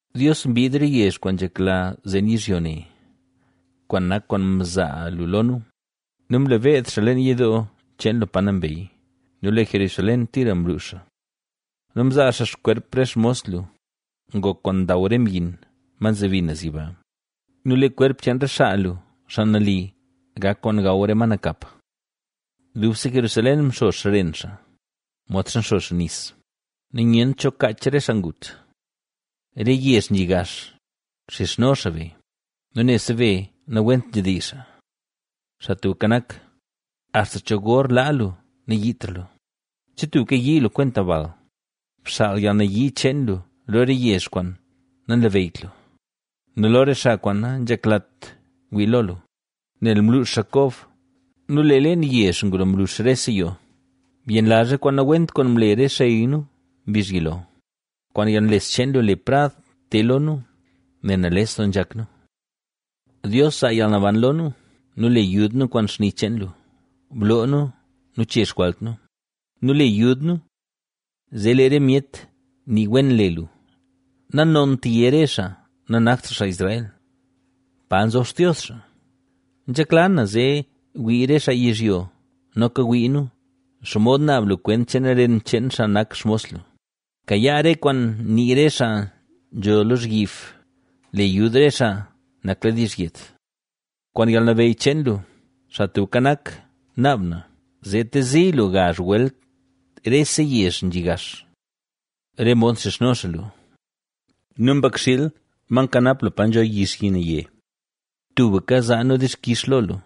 Dios, mbiid re yezh kwaan nzhekla zen yizhyo ne, kwaan nak kwaan mzaa lu lo nu nu mle beed xaa leen yidoo cheen lu pa nambey nu lee Jerusalén tira mluux xaa. Nu mzaa xaa xkwerp re xmos lu, ngok kwaan ndaw re myin, ma nzebi naz yiba; nu lee kwerp cheen re xaa lu, xaa nali, gak kwaan gaw re ma nakap. Dubse Jerusalén mxo xren xaa, modxa nxo xaa nis nu nyent cho kaach re xaa ngut. Re yezh nzhi gax, nxizhno xaa be nu nebse be nawent nzhedizh xaa. Xaa Tubka Nak, ¿axta cho gor laa lu nayiitra lu? ¿Che tubka yii lu kwenta bal? Bxaal yalnayii cheen lu lo re yezh kwaan nanlabeyyt lu nu lo re xaa kwaan nanzheklat wii lo lu, nel mluux xaa Kob nu leen yezh ngulo mlux rese yoo. Byenlazh re kwaan nawent kwaan mle re xey nu mbizh yilo. ¡Kwaan yalnles cheen lu, le prad te lo nu, nel nales doo nzhak nu! Dios, zaa yalnaban lo nu, nu le yud nu kwaan xni cheen lu, bloo nu nu che xjwalt nu, nu le yud nu zee lee re myet nii wen le lu. Nanont yé re xaa nanakt xaa Israel: “¿Pa nzob Xtios xaa?” Nzhekla na zee wii re xaa yizhyo, noka wii nu, xomod naab lu kwent cheen ren cheen xaa nak xmos lu. Bkayaa re kwaan nii re xaa nzho lozhyib, le yud re xaa nakladiizh yet kwaan yalnabeyy cheen lu. Xaa Tubka Nak naab na, zee tezi lu gazh welt rese yezh nzhi gax, re mod mxizhno xaa lu. Nu nak yezh cheen lu nu mbakxiil, ma nkanap lu pa nzho yixyi naye; tubka zaa nu dixkix lo lu,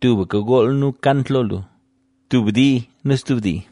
tubka gool nu kant lo lu, tub dii nu stub dii.